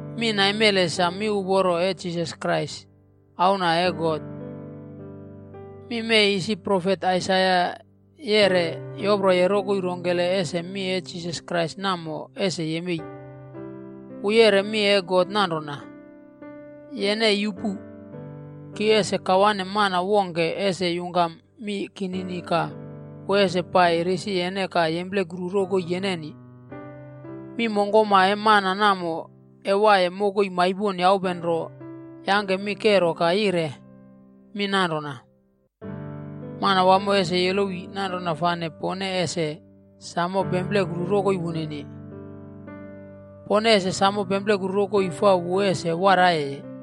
Mi naimele sa miuporo e Jisas Krais Auna e God. Mi mee isi profet Aisaia yeꞌre yoproye rokoi rongkele ese mi e Jisas Krais namo ese yemei. Wu yeꞌre mi e God nanrona, “Yene yupu. Ki ese kawane mana wongke ese yungkam mi kinini ka wu ese pai risi yene ka yemplekuru rokoi yeneni. Mi mongkoma e mana namo e waiye mokoi maipon yaupenro yangke mi kero ka yire mi nanrona, ‘Manawamo ese yolowi, nanrona fane pone ese samo pemplekuru rokoi wunini. Pone ese samo pemplekuru rokoi fa wu ese waraiye.a’”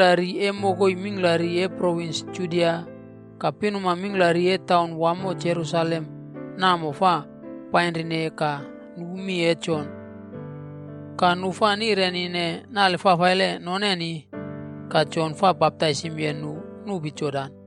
Pinuma mingklari e mokoi mingklari e provins Judia ka pinuma mingklari e taunwamo Jerusalem namo fa painrine ka nupu mi e Jon. Ka nu fa nirenine nale fafaile noneni ka Jon fa baptaisimye nu nupi Jordan.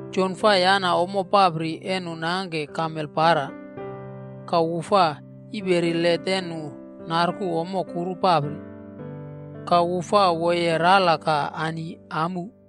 Jon fa yana ommo papri e nu nangke kamel para,bc ka wu fa yiperi let e nu narku ommo kuru papri. Ka wu fa woye rala ka ani amu.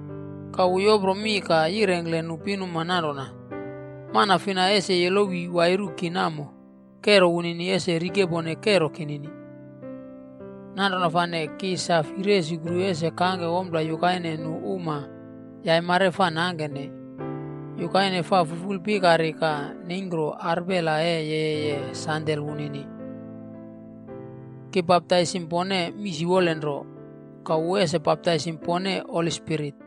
Ka wu yopro mi ka yirengkle nu pinuma nanrona, “Mana fina ese yolowi wairu ki namo, kero wunini ese rikepone kero kinini. Nanrona fane ki sa fi resukru ese kangke ompla yukaine nu uma yaimare fa nangkene, yukaine fa fufula pikari ka neingkro arpela e yeye sandel wunini. Ki baptaisim pone mii siwolenro, ka wu ese baptaisim pone Holi Spirit.”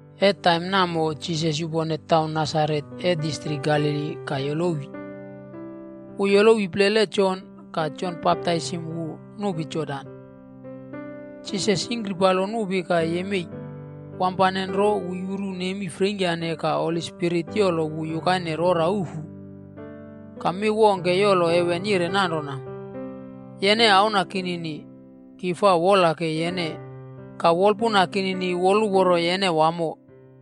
E taim namo, Jisas yupone taun Nasaret e distrik Galili ka yolowi. Wu yolowi plele Jon ka Jon baptaisim wu nupi Jordan. Jisas yingkripalo nupi ka yemei, wampane nro wu yuru nemi freingkyane ka Holi Spirit yolo wu yukaine rora ufu. Ka mi wongke yolo heven yire nanrona, “Yene auna kinini. Ki fa wolake yene. Ka wolpuna kinini woluporo yene wamo.”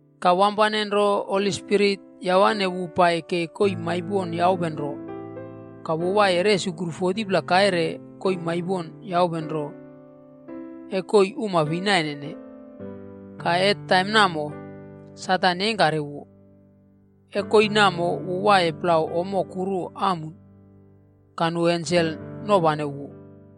Ka wampane nro Holi Spirit yawane wu pai kei koii maipon yaupenro. Ka wu waiye resukru 40pla kaire koii maipon yaupenro e koii uma fei nainene. Ka e taim namo, Satan yeingkari wu. E koii namo wu waiye plau ommo kuru amun. Ka nu ensel nopane wu.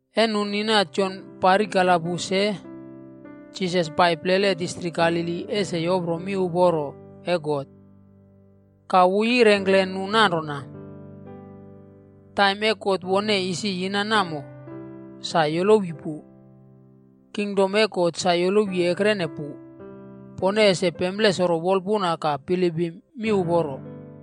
E nu nina Jon pari kalabus se, Jisas pai plele distrik Galili ese yopro miuporo e God. Ka wu yirengkle nu nanrona, “Taim God wone isi yina namo, sa yolowi pu. Kingdom e God sa yolowi ekrene pu. Pone ese pemplesoro wolpuna ka bilipim miuporo.”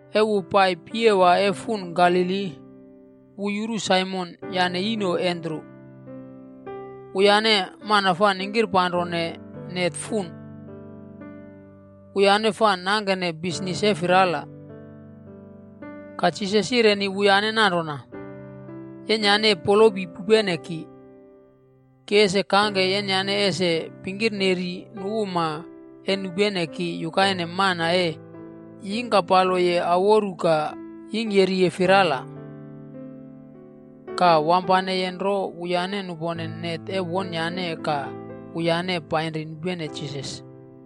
E wu pai piyewa e fun Galili, wu yuru Saimon yane ino Andru. Wuyane mana fa ningkirpanrone net fun. Wuyane fa nangkene bisnis e firala. Ka Jisas yireni wuyane nanrona, “Yenyane polopi pupene ki. Ki ese kangke yenyane ese pingkirneri nu uma e nupenene ki yukaine mana e yingkapaloye aworu ka yingkiryeriye firala.” Ka wampaneye nro, wuyane nupone net wonyane ka wuyane painri nupene Jisas.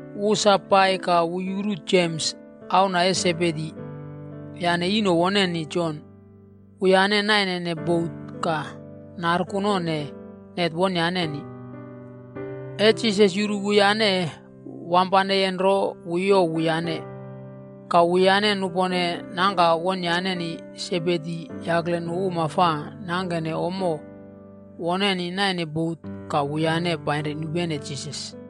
Wu as pai ka wu yuru Jems auna e Sebedi, yane ino woneni Jon. Wuyane nainene bot ka narkunone net wonyaneni. E Jisas yuru wuyane, wampaneye nro wu youw wuyane. Ka wuyane nupone nangka wonyane Sebedi yakle nu uma fa nangkene ommo woneni naine bot ka wuyane painri nupene Jisas.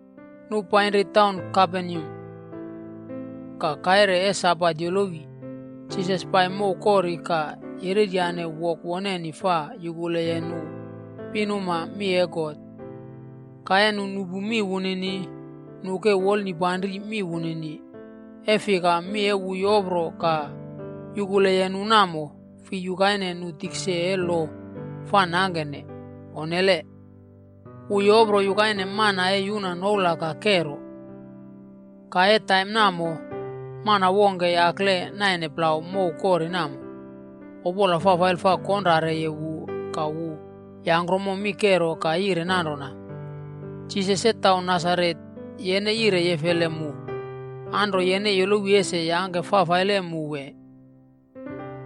Nu painri taun Kaperneam. Ka kaire e Sabat yolowi, Jisas pai mow kori ka yereryane wok woneni fa yukuleye nu pinuma mi e God. Ka e nu nupu mi wunini, nu ke wolnipanri mi wunini, e fika, mi e wu yopro ka yukuleye nu namo, fi yukaine nu tikse e lo fa nangkene, onnele. Wu yopro yukaine mana e yuna noula ka kero. Ka e taim namo, mana wongke yakle naine plau mow kori namo, opola fafaile fa konrare wu ka wu yangkromo mi kero ka yire nanrona, Jisas e taun Nasaret, yene yire yefeleye mu? Anro yene yolowi ese yangke fafaile mu wee?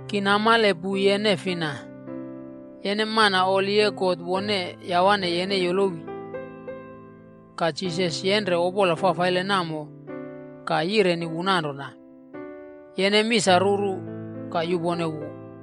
Ki namale pu yene fina. Yene mana holi e God wone yawane yene yolowi. Ka Jisas yenre opola fafaile namo ka yireni wu nanrona, “Yene misaruru ka yupone wu.”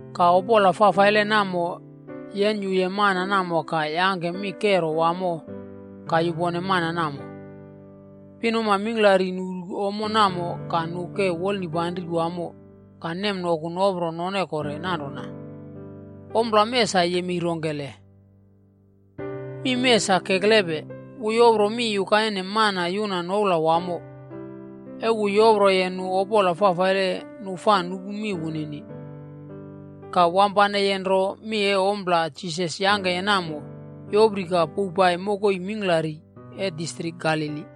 Ka opola fafaile namo yenyuye mana namo ka yangke mi kero wamo ka yupone mana namo. Pinuma mingklari nuru ommo namo ka nu ke wolnipanri wamo ka nemnoku nopro none kore nanrona, “Ompla mee sa yemei rongkele? Mi mee sa keklepe, wu yopro mi yukaine mana yuna noula wamo. E wu yoproye nu opola fafaile nu fa nupu mi wunini.” Ka wampaneye nro mi e ompla Jisas yangkeye namo, yopri ka poupai mokoi mingklari e distrik Galili.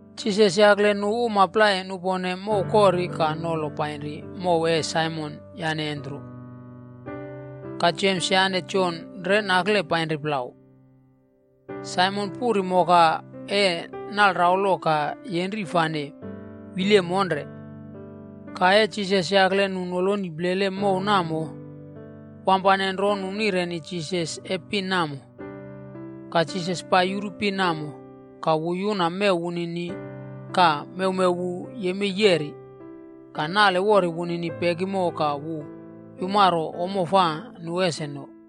Jisas yakle nu uma plai nupone mow kori ka nolo painri mow e Saimon yane Andru. Ka Jems yane Jon re nakle painri plau. Saimon puri moka e nalraulo ka yenri fane wile monre. Ka e Jisas yakle nu noloni plele mow namo, wampane nro nu nireni Jisas e pin namo. Ka Jisas pai yuru pin namo, ka wu yuna mew wunini ka mewmew wu yemei yeri. Ka nale wori wunini pekimo ka wu yumaro ommo fa nu ese no.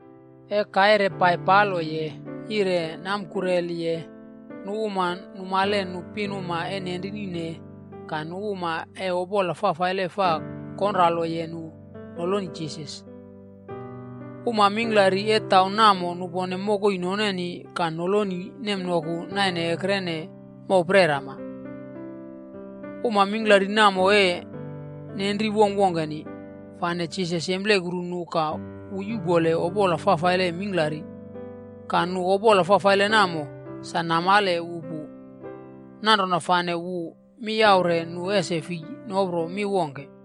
E kaire paipaloye yire namkureleye nu uma numale nu pinuma e nenrinine ka nu uma e opola fafaile fa konraloye nu noloni Jisas. Uma mingklari e taun namo nupone mokoi noneni ka noloni nemnoku naine ekrene mow prerama. Uma mingklari namo e nenri wongkwongkeni, fane Jisas yemplekuru nu ka wu yuꞌpole opola fafaile mingklari. Ka nu opola fafaile namo sa namale wu pu, nanrona fane wu mi yaure nu ese fi nopro mi wongke.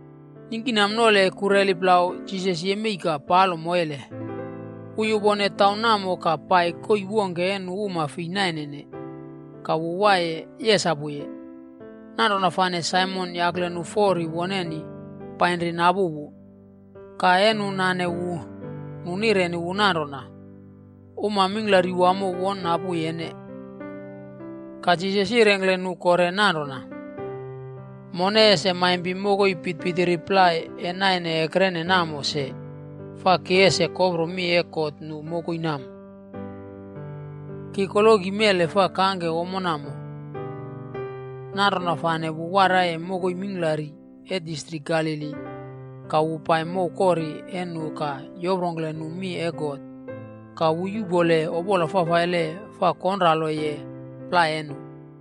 Ningkinamnole kureli plau Jisas yemei ka palo moile. Wu yupone taun namo ka pai koii wongke e nu uma fi nainene ka wu waiye yesapuye. Nanrona fane Saimon yakle nu fori woneni painri napu wu. Ka e nu nane wu, nu nireni wu nanrona, “Uma mingklari wamo won napu yene.” Ka Jisas yirengkle nu kore nanrona, “Mone ese maimpi mokoi pitpitiri plai e naine ekrene namo se, fa ki ese kopro mi e God nu mokoi namo. Ki koloki mele fa kangke ommo namo.” Nanrona fane wu waraiye mokoi mingklari e distrik Galili ka wu pai mow kori e nu ka yoprongkle nu mi e God. Ka wu yuꞌpoleye opola fafaile fa konraloye plai e nu.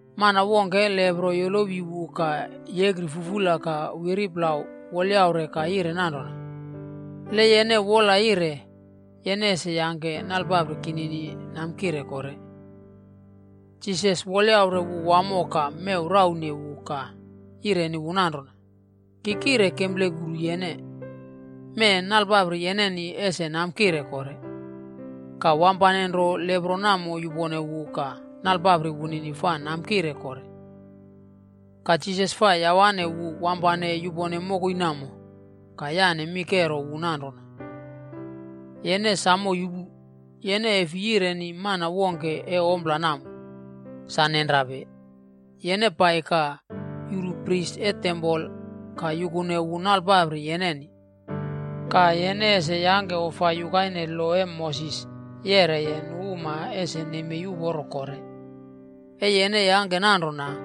Mana wongke e lepro yolowi wu ka yekri fufula ka wiri plau wolyaure ka yire nanrona, “Le yene wola yire, yene ese yangke nalpapri kinini namkire kore.” Jisas wolyaure wu wamo ka mew raune wu ka yireni wu nanrona, “Ki kire kemplekuru yene. Mee nalpapri yeneni ese namkire kore.” Ka wampane nro lepro namo yupone wu ka nalpapri wunini fa namkire kore. Ka Jisas fa yawane wu wampane yupone mokoi namo, ka yane mi kero wu nanrona, “Yene samo yupu, yene fa yireni mana wongke e ompla namo. Sa nenrape! Yene pai ka yuru pris e tempol ka yukune wu nalpapri yeneni. Ka yene ese yangke ofa yukaine lo e Moses yeꞌreye nu uma ese nemei uporo kore. E yene yangke nanrona,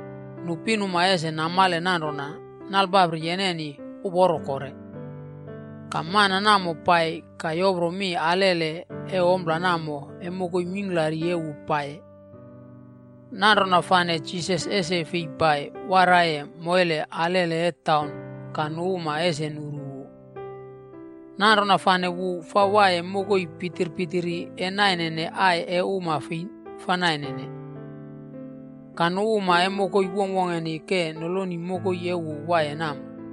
nu pinuma ese namale nanrona nalpapri yeneni uporo kore.” Ka, mana namo pai ka yopro mi alele e ompla namo e mokoi mingklari e wu paiye. Nanrona fane Jisas ese fei pai waraiye moile alele e taun ka nu uma ese nuru wu. Nanrona fane wu fa waiye mokoi pitpitiri e nainene ai e uma fei fa nainene. Ka, nu uma e mokoi wongkwongkeni ke noloni mokoi e wu waiye namo.